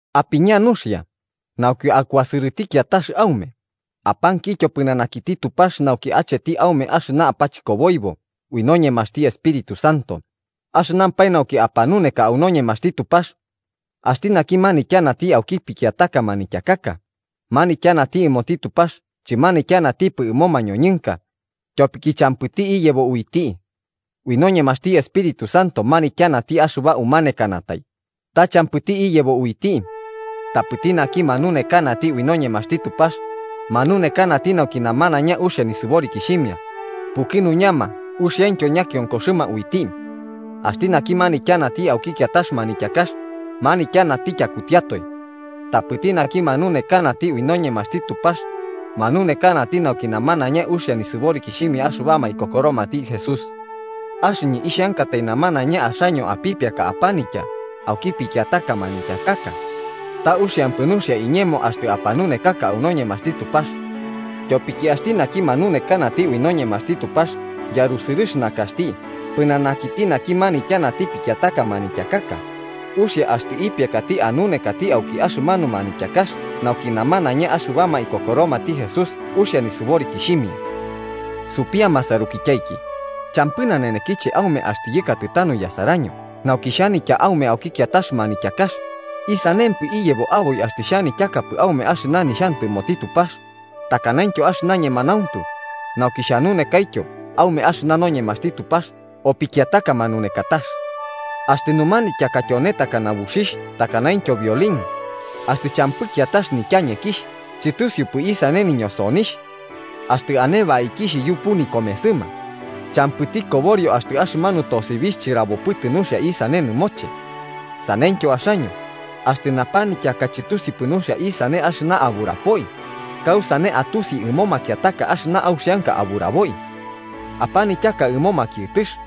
Apiña nuxia, nauki akuasɨrɨti kiatax aume, apankityo pɨnanakiti Tupax nauki acheti aume axɨna apachɨkoboibo ui noñemaxti Espíritu Santo, axɨnampae nauki apanuneka au noñemaxti Tupax. Axti naki manityanati auki pikiataka manityakaka, manityanati ɨmoti Tupax chɨmanityanatipɨ ɨmo mañoñɨnka, tyopiki champɨti iyebo uiti. Ui noñemaxti Espíritu Santo manityanati axɨba umanekanatai, ta champɨti iyebo uiti. Tapɨti naki manunekanati ui noñemaxti Tupax, manunekanati nauki namanaiña uxia nisɨborikixhimia, pukɨnuñama uxiaintyo ñakionkoxɨma uiti. Axti naki manityanati auki kiatax manityakax, manityanati tyakutiatoe. Tapɨti naki manunekanati au noñemaxti Tupax, manunekanati nauki namanaiña uxia nisɨborikixhimia axɨbama ikokoromati Jesús. Axɨñɨ ixhankatai namanaiña axaño apipiaka apanitya auki pikiataka manityakaka. Ta uxiampɨ nuxia iñemo axtɨ apanunekaka au noñemaxti Tupax. Tyopiki axti naki manunekanati ui noñemaxti Tupax yarusɨrɨx nakaxti pɨnanakiti naki manityanati pikiataka manityakaka, uxia axtɨ ipiakati anunekati auki axɨmanu manityakax nauki namanaiña axɨbama ikokoromati Jesús uxia nisɨborikixhimia. Supia, masarukityaiki, champɨ nanenekiche aume axtɨ yɨkatɨ tanu yasaraño nauki xhanitya aume auki kiatax manityakax, ¿isanempɨ iyebo aboi axtɨ chixhanityakapɨ aume axɨna nixhantɨmoti Tupax, takanaintyo axɨna ñemanauntu, nauki xhanunekaityo aume axɨna noñemaxti Tupax o pikiataka manunekatax? Axtɨ numanityaka tyone takana buxixh takanaintyo violín axtɨ champɨ kiatax nityañekixh, chɨtusiupɨ isane niñosonixh. Axtɨ ane baikixh yupu nikomesɨma, champɨti koborio axtɨ axɨmanu tosibixh chɨrabopɨtɨ nuxia isane nɨmoche. Saneityo axaño, axtɨ napanityaka chɨtusiupɨ nuxia isane axɨna aburapoi, ¿kausane atusi ɨmo makiataka axɨna auxianka aburaboi? ¡Apanityaka ɨmo makiɨtɨx!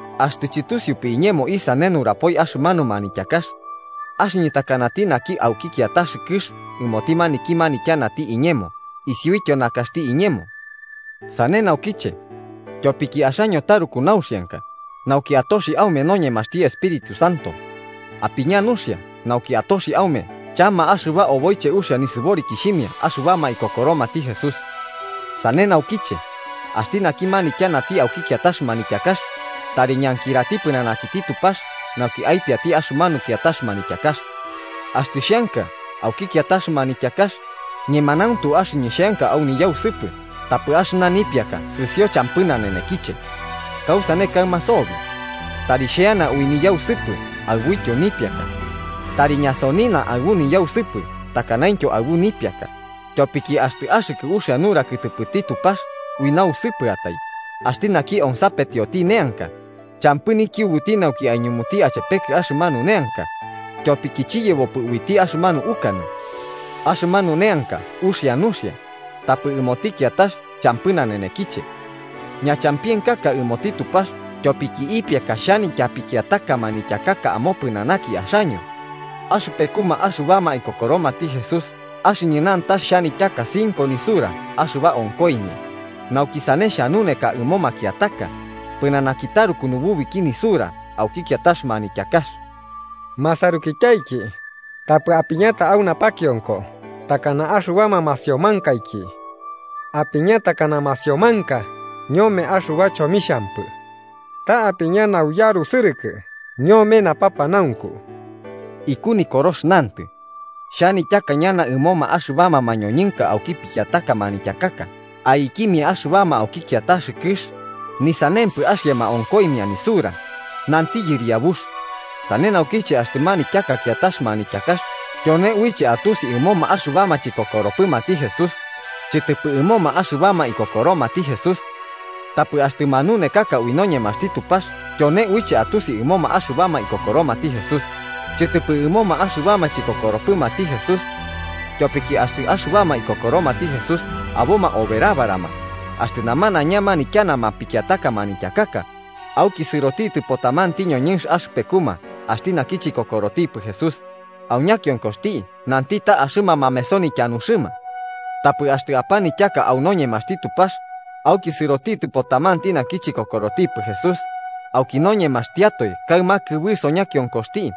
Axtɨ chɨtusiupɨ iñemo isane nurapoi axɨmanu manityakax, axɨñɨ takanati naki auki kiatax kɨx ɨmoti maniki manityanati iñemo isiuityo nakaxti iñemo. Sane naukiche, tyopiki axaño taruku nauxianka nauki atoxi aume noñemaxti Espíritu Santo, apiña nuxia nauki atoxi aume chama axɨba oboiche uxia nisɨborikixhimia axɨbama ikokoromati Jesús. Sane naukiche, axti naki manityanati auki kiatax manityakax, tari ñankirati pɨnanakiti Tupax nauki aipiati axɨmanu kiatax manityakax. Axtɨ xheanka auki kiatax manityakax, ñemanauntu axɨñɨ xheanka au niyausɨpɨ tapɨ axɨna nipiaka sɨsio champɨ nanenekiche. ¿Kausane kaɨma sobi? Tari xheana ui niyausɨpɨ aɨbuityo nipiaka. Tari ñasonina aɨbu niyausɨpɨ takanaintyo aɨbu nipiaka, tyopiki axtɨ axɨkɨ uxia nura kɨtɨpɨti Tupax ui nausɨpɨatai, axti naki onsapetioti neanka, champɨ nikiubuti nauki aiñumuti achepekɨ axɨmanu neanka, tyopiki chiyebopɨ uiti axɨmanu ukanɨ. Axɨmanu neanka uxia nuxia, tapɨ ɨmoti kiatax champɨ nanenekiche. Ñachampienkaka ɨmoti Tupax tyopiki ipiaka xhanitya pikiataka manityakaka amopɨnanaki axaño. Axɨpekuma axɨbama ikokoromati Jesús axɨñɨ nantax xhanityaka cinco nisura axɨba onkoimia, nauki sane xhanuneka ɨmo makiataka, pɨnanaki taruku nububiki nisura auki kiatax manityakax. Masarukityaiki, tapɨ apiñata au napakionko takana axɨbama masiomankaiki. Apiña takana masiomanka ñome axɨba chomixhampɨ. Ta apiña nauyarusɨrɨkɨ ñome napapanaunku. Iku Nikorox nantɨ: “Xhanityaka ñana ɨmoma axɨbama mañoñɨnka auki pikiataka manityakaka aikimia axɨbama auki kiatax kɨx, ni sanempɨ axiama onkoimia nisura, nanti Yɨriabux.” Sane naukiche, axtɨ manityaka kiatax manityakax tyone uiche atusi ɨmoma axɨbama chikokoropɨmati Jesús, chɨtɨpɨ ɨmoma axɨbama ikokoromati Jesús. Tapɨ axtɨ manunekaka ui noñemaxti Tupax tyone uiche atusi ɨmoma axɨbama ikokoromati Jesús, chɨtɨpɨ ɨmoma axɨbama chikokoropɨmati Jesús. Tyopiki axtɨ axɨbama ikokoromati Jesús aboma oberabarama, axtɨ namanaiña manityanama pikiataka manityakaka, auki sɨrotitɨpo tamanti ñoñɨnx axɨpekuma axti naki chikokorotipɨ Jesús, au ñakionkoxti nanti ta axɨma mameso nityanuxɨma. Tapɨ axtɨ apanityaka au noñemaxti Tupax, auki sɨrotitɨpo tamanti naki chikokorotipɨ Jesús, auki noñemaxtiatoe kaɨma kɨbɨso ñakiokoxti,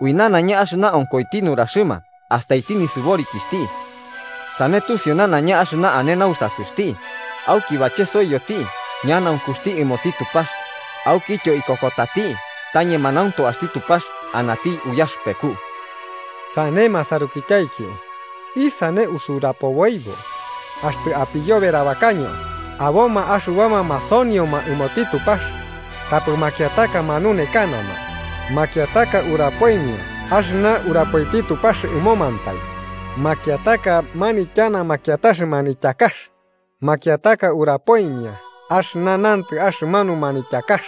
ui nanaiña axɨna onkoiti nuraxɨma astaiti nisɨborikixhti. Sane tusiu nanaiña axɨna ane au nausasɨxti, auki bachesoiyoti ñanaunkuxti ɨmoti Tupax, aukityo ikokotati ta ñemanauntu axti Tupax anati uyaxɨpeku. Sane masarukityaiki, ¿isane usurapoboibo? Axtɨ apiyoberabakaño, aboma axɨbama masonioma ɨmoti Tupax, tapɨ makiataka manunekanama, makiataka urapoimia axɨna urapoiti Tupax ɨmomantai, makiataka manityanama kiatax manityakax, makiataka urapoimia axɨna nantɨ axɨmanu manityakax.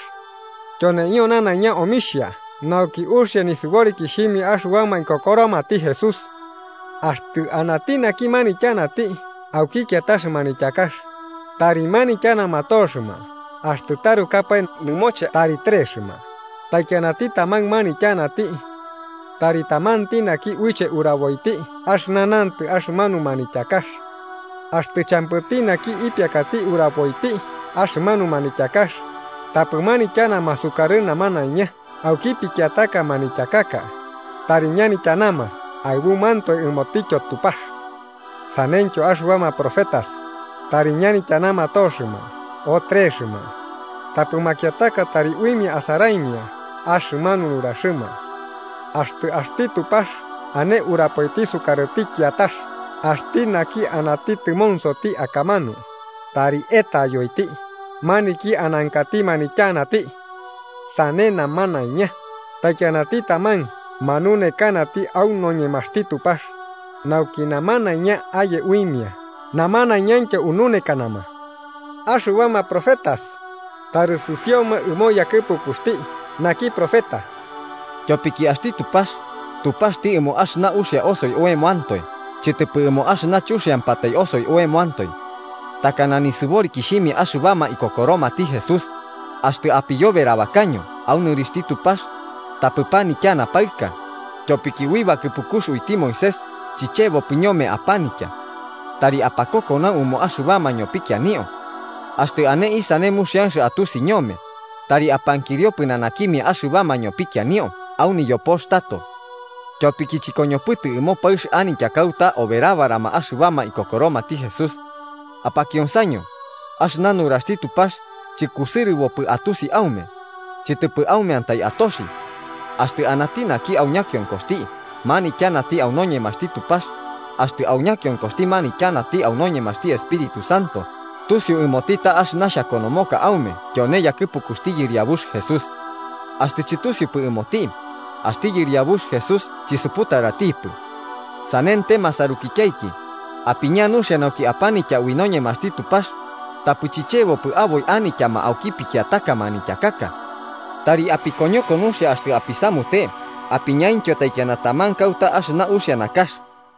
Tyoneio nanaiña omixhia nauki uxia nisɨborikixhimia axɨbama ikokoromati Jesús. Axtɨ anati naki manityanati auki kiatax manityakax, tari ñanityanama toxɨma axtɨ tarukapae nɨmoche tari trexɨma, taikianati taman manityanati. Tari tamanti naki uiche uraboiti axɨna nantɨ axɨmanu manityakax. Axtɨ champɨti naki ipiakati uraboiti axɨmanu manityakax, tapɨ manityanama sukarɨ namanaiña auki pikiataka manityakaka, tari ñanityanama aɨbumantoe ɨmotityo Tupax. Saneityo axɨbama profetas, tari ñanityanama toxɨma o trexɨma, tapɨ makiataka tari uimia asaraimia axɨmanu nuraxɨma. Axtɨ axti Tupax ane urapoiti sukarɨti kiatax axti naki anati tɨmonsoti akamanu, tari etayoiti maniki anankati manityanati. Sane namanaiña, taikianati taman manunekanati au noñemaxti Tupax, nauki namanaiña aye uimia namanaiñaintyo ununekanama. Axɨbama profetas, tari sɨsioma ɨmo yakɨpukuxti naki profeta, tyopiki axti Tupax Tupaxti ɨmo axɨna uxia osoi oemantoe chɨtɨpɨ ɨmo axɨna chuxiampatai osoi oemantoe. Takana nisɨborikixhimia axɨbama ikokoromati Jesús, axtɨ apiyoberabakaño au nɨrixhti Tupax, tapɨ panityana paɨka, tyopiki ui bakɨpukux uiti Moisés chichebopɨ ñome apanitya. Tari apakokonau ɨmo axɨbama ñopikianio. Axtɨ ane isane muxianx atusi ñome, tari apankirio pɨnanakimia axɨbama ñopikianio au niyopox tato. Tyopiki chɨkoñopɨtɨ ɨmo paɨx anitya kauta oberabarama axɨbama ikokoromati Jesús. Apakionsaño, axɨna nuraxti Tupax chɨkusɨrɨbopɨ atusi aume, chɨtɨpɨ aumeantai atoxi. Axtɨ anati naki au ñakionkoxti manityanati au noñemaxti Tupax, axtɨ au ñakionkoxti manityanati ui noñemaxti Espíritu Santo, tusiu ɨmoti ta axɨna xhakonomoka aume tyone yakɨpukuxti Yɨriabux Jesús. Axtɨ chɨtusiupɨ ɨmoti, axti Yɨriabux Jesús chisuputaratipɨ. Sanente, masarukityaiki, apiña nuxia nauki apanitya ui noñemaxti Tupax, tapɨ chichebopɨ aboi anityama auki pikiataka manityakaka. Tari apikoñoko nuxia axtɨ apisamute apiñaintyo taikiana taman kauta axɨna uxia nakax.